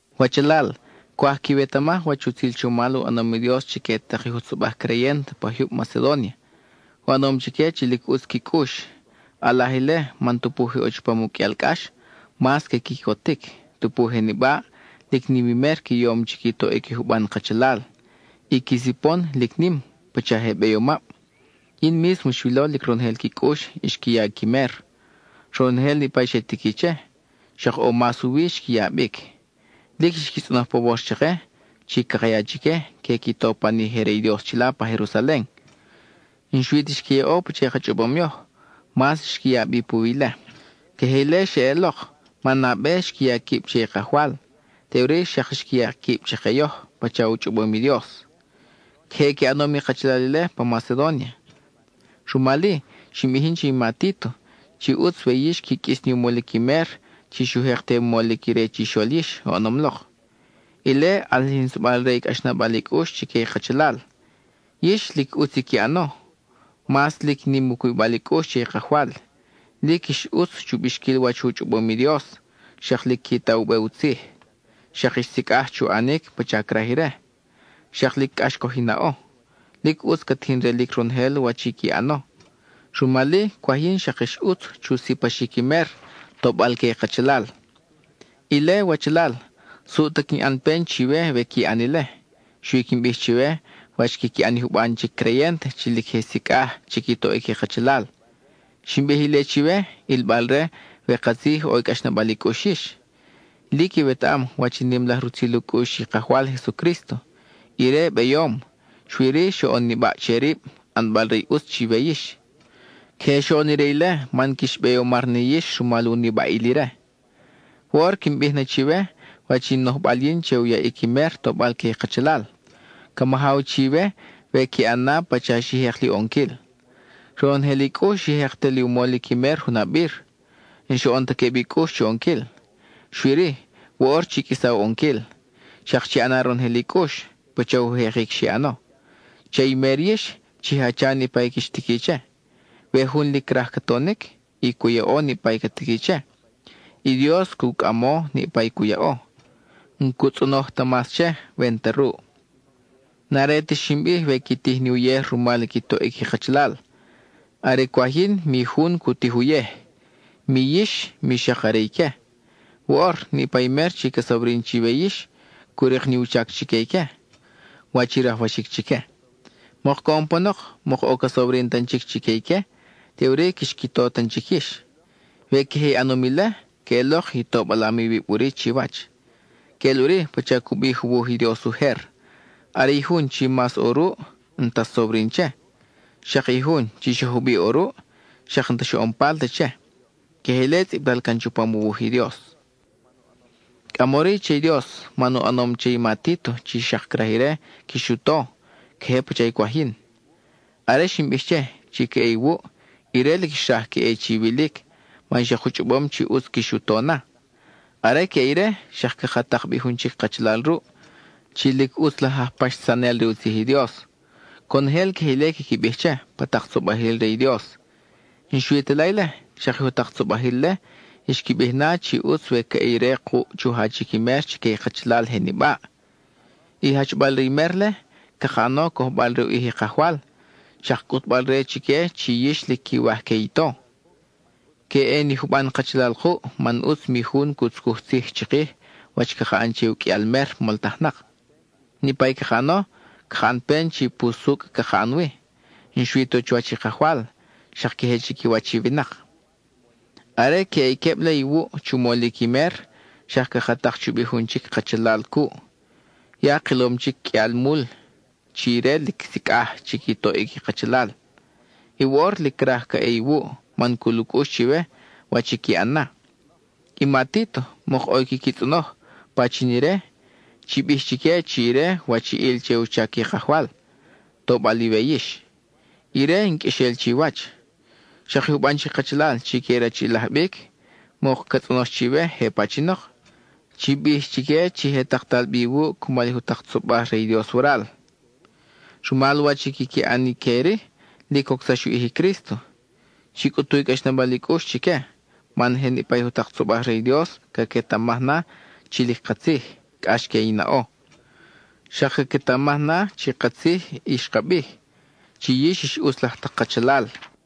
Wachalal, cwaj quiwetamaj wach utzil chomal u ʼanom i Dios chique tak i jutzobaj creyent pa jyub Macedónia. U ʼanom chique chi lic ʼutz qui cʼux. ʼAlaj ile man tupu je ʼo chupam u qʼuial cʼax, mas que quicotic; tupu je nibaʼ, lic nim i mer qui yom chi qui toʼic i juban kachalal; i qui sipon, lic nim, pacha je beyomab. Yin mísmo xwilo lic ronojel qui cʼux xqui ya qui mer, ronojel niʼpa i xe tiqui che; xak ʼo mas u wi xqui ya bic. Lic xqui tzʼonoj pawor chake chi caka ya chique que qui to pan i je re i Dios chila pa Jerusalen. N-xui ta xqui yaʼo pacha i ka chʼobom yoj, mas xqui ya bi puwi ile. Queje ile xeʼelok, man nabe xqui ya quib che i Kajwal, teʼuri xak xqui ya quib chake yoj pacha u chʼobom i Dios. Queje qui ʼanom i kachalal ile pa Macedónia, rumal-i, xin bij yin che i ma Títo chi ʼutz we yix qui qʼuis ni u molic i mer chi xu jek te u molic ire chixol yix oʼonom lok. Ile ʼalijinsabal re i cʼaxnabal i cʼux chique i kachalal. Yix, lic ʼutz i qui ʼano: mas lic nim u cubibal i cʼux che i Kajwal; lic ix ʼutz chu bixquil wach u chʼobom i Dios, xak lic qui ta u be u tzij, xak ix sicʼaj chu ʼanic pacha craj ire, xak lic cʼax coj i naʼo. Lic ʼutz ca tijin relic ronojel wach i qui ʼano, rumal-i cwaj yin xak ix ʼutz chu sipaxic i mer, tobal que i kachalal. Ile, wachalal, suʼ ta quin ʼan pen chiwe we qui ʼan ile. Xui quin bij chiwe wach quiqui ʼan i juban chic creyent chi lic je sicʼaj chi qui toʼic i cachalal. Xin bij ile chiwe, ʼilbal-re we katzij ʼo i cʼaxnabal i cʼux yix. Lic iwetaʼam wach i nim laj rutzil u cʼux i Kajwal Jesucrísto. Ire beyom, xui-ri, xoʼon nibaʼ che rib, ʼanbal re i ʼutz chiwe yix. Queje xoʼon ire ile man quix beyomar ni yix rumal u nibaʼil ire. Woʼor quin bij na chiwe wach in nojbal yin che u yaʼic i mer tobal que i kachalal; ca majaw chiwe we qui ʼan na pacha xi jek li u ʼonquil. Ronojel i cʼux xi jek te li u molic i mer junabir; n-xoʼon ta queb i cʼux chu ʼonquil. Xui-ri, woʼor chi qʼuisa u ʼonquil; xak chi ʼana ronojel i cʼux, pacha u jekic xi ʼano. Che i mer yix, chi jacha niʼpa i quix tiqui che. We jun lic craj ca tonic, y cu yaʼo niʼpa i ca tiqui che, i Dios cu cʼamo niʼpa i cu yaʼo; n-cu tzʼonoj ta mas che, we n-ta ruʼ. N-are ti xin bij we qui tij ni uyej rumal qui toʼic i kachalal. Are cwaj yin mi jun cu tij uyej, mi yix mi xak are ique. Woʼor, niʼpa i mer chi ca sobrin chiwe yix cu rik ni u chac chique ique, wach i rajwaxic chique. Mok coʼon panok, mok ʼo ca sobrin tan chic chique ique, teʼuri quix qui to tan chic yix. We queje i ʼanom ile, queʼelok i tobalam iwib ʼuri chiwach. Queʼel ʼuri pacha cu bij u wuj i Dios ujer: “Are i jun chi mas ʼo ruʼ, n-ta xsobrin che; xak i jun chi xa jubiʼ ʼo ruʼ, xak n-ta xoʼon palt che.” (Queje ile tzʼibtal can chupam u wuj i Dios.) Cʼamori che i Dios man u ʼanom che i ma Títo chi xak craj ire quix u to queje pacha i cwaj yin. Are xin bij che, chi ca ʼe iwuʼ, ire lic xraj ca ʼe chiwilic man xak u chʼobom chi ʼutz quix u to na. Are ca ʼe ire, xak caka tak bi jun chic kachalal ruʼ, chi lic ʼutz laj aj paxsanel re u tzij i Dios; conojel queje ile quiqui bij che, pa tak tzobajil re i Dios. N-xui ta la ile, xak i jutak tzobajil-le xqui bij na chi ʼutz we ca ʼe ire kuʼ chu jachic i mer chique i kachalal je nibaʼ. I jachbal re i mer-le, caka ʼano cojbal re u ʼij i Kajwal, xak cʼutbal-re chique chi yix lic quiwaj que i to. Que ʼe ni juban kachalal kuʼ man ʼutz mi jun cu tzucuj tzij chikij wach caka ʼan che u qʼuial mer moltajnak. Niʼpa i caka ʼano, caka ʼan pen chi pusucʼ caka ʼan wi, n-xui ta chuwach i Kajwal, xak queje chiquiwach i winak. Are que ʼe i queb-le iwuʼ chu molic i mer, xak caka tak chubi jun chic kachalal cuʼ. Ya kilom chic qʼuialmul chi ire lic sicʼaj chi qui toʼic i kachalal, y woʼor lic craj ca ʼe iwuʼ man cul u cʼux chiwe, wach i qui ʼan na. I ma Títo, mok ʼo i quiqui tzʼonoj pachin ire; chi bij chique chi ire wachiʼil che u chac i Kajwal, tobal iwe yix; ire in qʼuexel chiwach. Xak i juban chic kachalal chi que rachiʼilaj bic, mok ca tzʼonox chiwe je pachinok; chi bij chi je taktal bi iwuʼ cumal i jutak tzobaj re i Dios waral. Rumal wach i quiqui ʼan ique-ri, lic cocsax u ʼij i Crísto. Chi cʼutu i cʼaxnabal i cʼux chique, man je niʼpa i jutak tzobaj re i Dios caquetamaj na chi lic katzij, cʼax que i naʼo. Xak caquetamaj na chi katzij i xka bij, chi yix ix ʼutz laj tak kachalal.